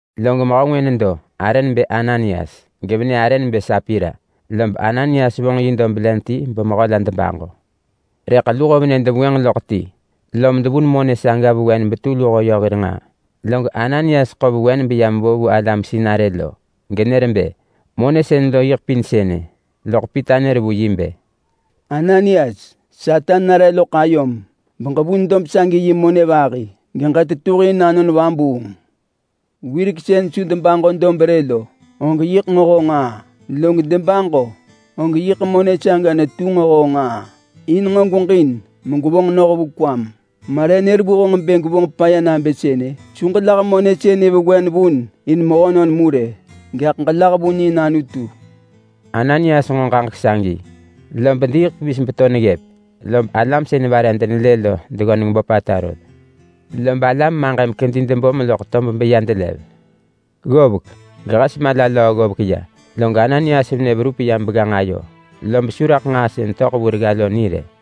Log mehö ngwë nedo arë nebë Ananias, gevenë arë nebë Sapira. Lob Ananias vonġ yi dob len ti bemehö la debaġo. Rëḳ luho venë devengwënġ loḳ ti, lom devun monë saga vewen betu luho yö hir nġaa. Log Ananias ḳo vewen beya mevo vu alam sinarë genër bë monë sën lo yiḳ pin sënë. Loḳ Pita nër vu yi bë, “Ananias, Satan nare loḳ ayom beġevun dob sagi yi monë vahi geġetetuhin Anon Vabuung. Wirek sën su debaġo dob rë lo, og yiḳ nġo honġ nġaa! Log debaġo om maḳ monë saga netu honġ nġaa in bë gweġin megwevonġ noh vu kwam. Ma re nër vu honġ bë gwevonġ paya nabë sënë? Su ġelah monë sënë vewen vun in mehönon mu rë, gaḳ ġelah vun in Anutu!” Ananias nġo ġaġek sagi, lob diiḳ pevis beto neggëp, lob alam sën vare denelë lo deggöneng böpata rot. Lob alam maġëm kedi debom loḳ tob beya delev. Ggovek gehes mala löö ggovek ya, log Ananias venë verup yam begganġ ayo, lob su raḳ nġaa sën töḳ vu regga lo ni rë.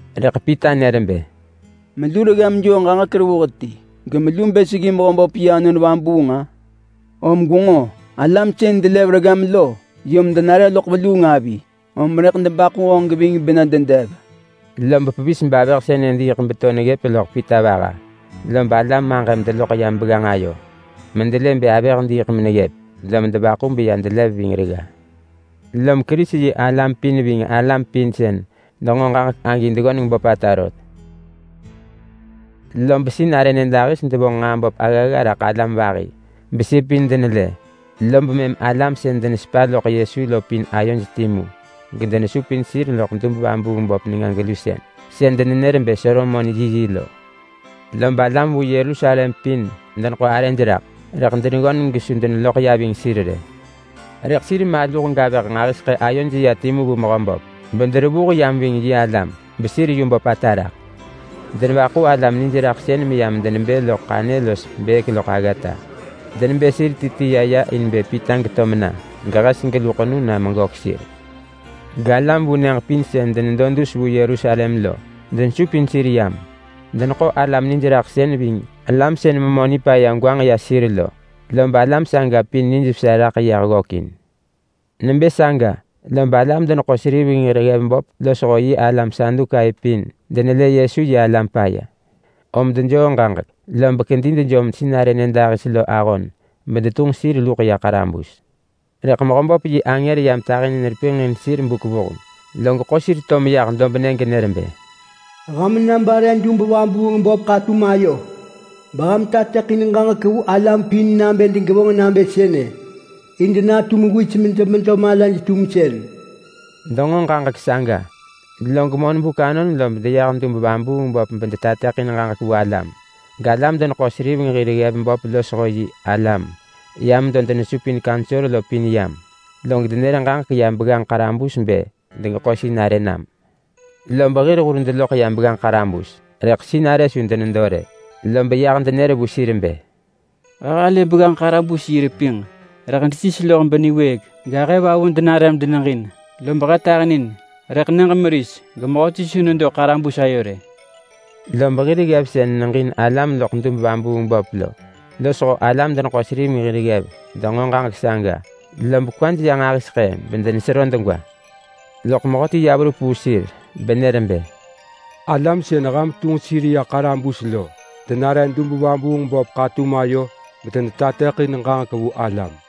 Rëḳ Pita nër bë, “Melu reggam joo ġaġek revuh ti gemelu bë seggi Mehöböp yi Anon Vabuung-a? Om gwenġo! Alam sën delev reggam lo yom denare loḳ veluung avi, om rëḳ debaḳu honġ geving bena dedev!” Lob pevis bavëh saga diiḳ beto neggëp loḳ Pita vaha, lob alam maġëm deloḳ yam begganġ ayo medelë bë avëh diiḳ meneggëp, lom devaḳu beya delev ving regga. Lom Kerisi-yi-alam pin ving alam pin sën denġo ġaġek agi deggöneng böpata rot. Lob sinarë nyëdahis devonġ nġaa böp aggagga raḳ alam vahi besir pin denelë, lob mëm alam sën denesepa loḳ Yesu lo pin ayoj timu gedenesupin sir loḳ dub-vabuung-böp nenga-gelusën sën denenër bë Solomon yiyi lo. Lob alam vu Yerusalem pin deḳo arëj raḳ, rëḳ deggöneng gesu desupin sir ya ving sir rë. Rëḳ alam maluh los avëh nġahiseḳë ayoj ya timu vu Mehöböp bederevuh yam ving yi alam, bedetu yu böpata raḳ. Lob tum denevaḳu alam nijraḳsën meyam debë neggëp loḳ ḳanyë los bëk loḳ aggata, lob denebë sir ti ti ya ya in bë Pita geto mena, og hes gelu ḳenu na mejaḳ sir. Galam vu nyëġ pin sën denedo dus vu Yerusalem lo denesupin sir yam. Deneḳo alam nijraḳsën ving alam sën memö nipaya gwanġ ya sir lo, lob alam saga pin nijvesa raḳ yah ggökin. Nebë saga lob alam-deneḳo-seriveng hir ggev böp losho yi alam Sadukai pin denelë Yesu yi alam paya, om dejoo ġaġek lob kedi dejom sinarë nyëdahis lo ahon bedetunġ sir luḳ ya ḳarabus. Rëḳ Mehöböp yi angër yam tahinin repinġ in sir buk vuheng, log ḳo sir to meyah dobnë genër bë, “Ham na bare dub-vabuung-böp ḳatum ayo beham tateḳin ġaġek vu alam pin nabë degevonġ nabë sënë in denatu mewis medemedo malaj-tumsën.” Denġo ġaġek saga, log monbuk anon lob deyah dub-vabuung-böp bedetateḳin ġaġek vu alam. Getum alam-deneḳo-seriveng hir ggev böp losho yi alam ya medo denesupin kaunsor pin yam. Log denër ġaġek ya begganġ ḳarabus bë degeḳo sinarë nam. Lob hir hur deloḳ ya begganġ ḳarabus, rëḳ sinarë su denedo rë. Lob yah denër vu sir bë, “He halë begganġ ḳarabus yi repinġ rëḳ desis loḳ beniwëëk gahëvavu denare medeneġin. Lob he tahinin, rëḳ he su atöḳ raḳ mehöti genedo begganġ ayo rë.” Lob hir ggev sën neġin alam loḳ dub-vabuung-böp lo losho alam-deneḳo-seriveng hir ggev denġo ġaġek saga, lob kwaj ya nġahiseḳë bedenesero degwa. Loḳ mehöti ya verup vu sir benër bë, “Alam sën ham tunġ sir ya ḳarabus lo denare dub-vabuung-böp ḳatum ayo medenetateḳin ġaġek vu alam.”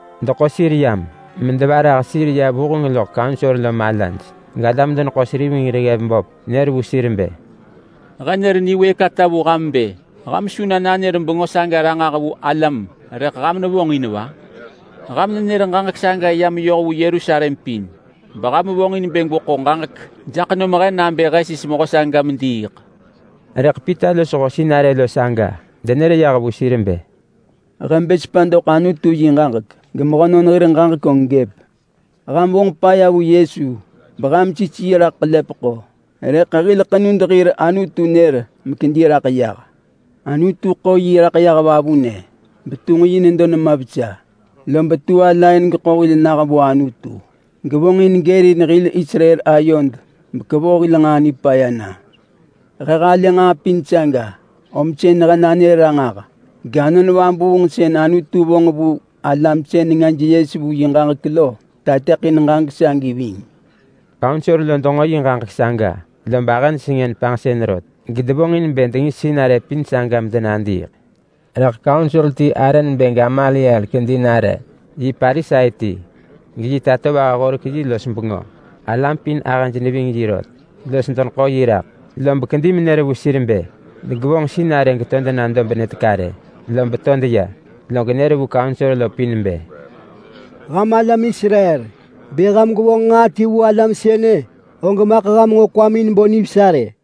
Deḳo sir yam medevarah sir nare vuheng loḳ kaunsor lo malaj, galam-deneḳo-seriveng hir ggev böp nër vu sir bë, “He nër niwëëk ata vu ham bë ham su na nanër bengö saga ranġah vu alam, rëḳ ham nevonġ in va? Ham nenër ġaġek saga ya meyoh vu Yerusalem pin beham vonġin bë gweḳo ġaġek jaḳ nom he nabë he sis mehö saga mediiḳ!” Rëḳ Pita losho sinarë saga denër yah vu sir bë, “He bë sepa doḳ Anutu yi ġaġek namuġin, gemehönon hir ġaġek gëp tamusën! Ham vonġ paya vu Yesu beham sis yi raḳ ḳelepeḳo, rëḳ hil ḳenud hir Anutu nër mekedi raḳ yah. Anutu ḳo yi raḳ yah vavunë betunġ yi nedo nema vesa. Lob tu ala in geḳo hil nah vu Anutu, gevonġin gërin hil Israel ayod gekevoh hil nġaa nipaya na. He halë nġaa pin saga, om sën he nanër ranġah gAnon Vabuung sën Anutu vonġ vu alam sën nengaj yes vu yi ġaġek lo tateḳin ġaġek sagi ving.” Kaunsor lo denġo yi ġaġek saga lob ahëj sengën panġsën rot gedevonġin bë dengis sinarë pin saga medenadiiḳ. Rëḳ kaunsor ti arë nebë Gamaliel kedi nare. Yi Parisai ti, geyi tatovaha horek yi los bengö. Alam pin ahëj neving yi rot los deneḳo yi raḳ. Lob kedi menër vu sir bë degevonġ sinarë geto dena dobnë teka rë, lob to deya. Log nër vu kaunsor pin bë, “Ham alam Israel! Bë ham gwevonġ nġaa ti vu alam sënë, og maḳ ham nġo kwamin bo nivesa rë.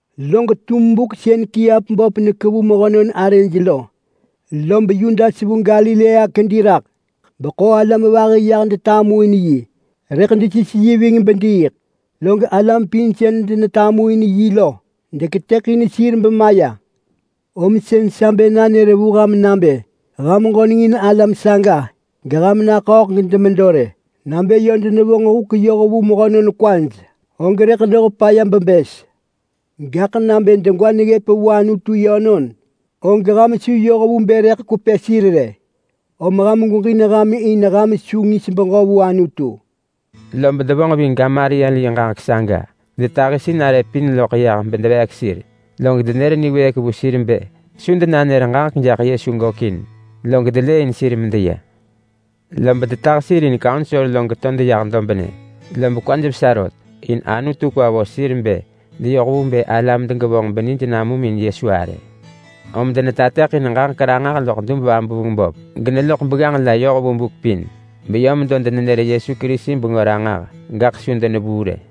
Log tum buk sën kiap böp nekevu mehönon arëj lo lob Yudas vu Galilea kedi raḳ beḳo alam vahi yah detamuin yi. Rëḳ desis yi ving bediiḳ, log alam pin sën denetamuin yi lo deketëḳin sir bemaya. Om sën sa bë nanër vu ham nabë ham ġöneng in alam saga, geham naḳööḳ gedemedo rë. Nabë yö denevonġ huk yoh vu mehönon kwaj, og rëḳ noh paya bebës. Gaḳ nabë degwa neggëp vu Anutu yönon, og ham su yoh vu bë rëḳ kwepë sir rë, om ham gweġin ham in ham su ngis beġö vu Anutu!” Lob devonġ ving Gamaliel yi ġaġek saga, gedetahi sinarë pin loḳ yah bedeveek sir, log denër niwëëk vu sir bë su denanër Yesu bengö ranġah log delëëin sir medeya. Lob mëm devuu kaunsor ya geto deyah dobnë, lob kwaj vesa rot in Anutu ḳo sir raḳ belë sir bë deyoh vu bë alam degevonġ benij namum in Yesu arë. Lob medo denetateḳin ġaġek ranġah loḳ dub-vabuung-böp geloḳ begganġ la yoh vu buk pin. Beyö medo denenër Yesu Kerisi bengö ranġah gaḳ su denevuu rë.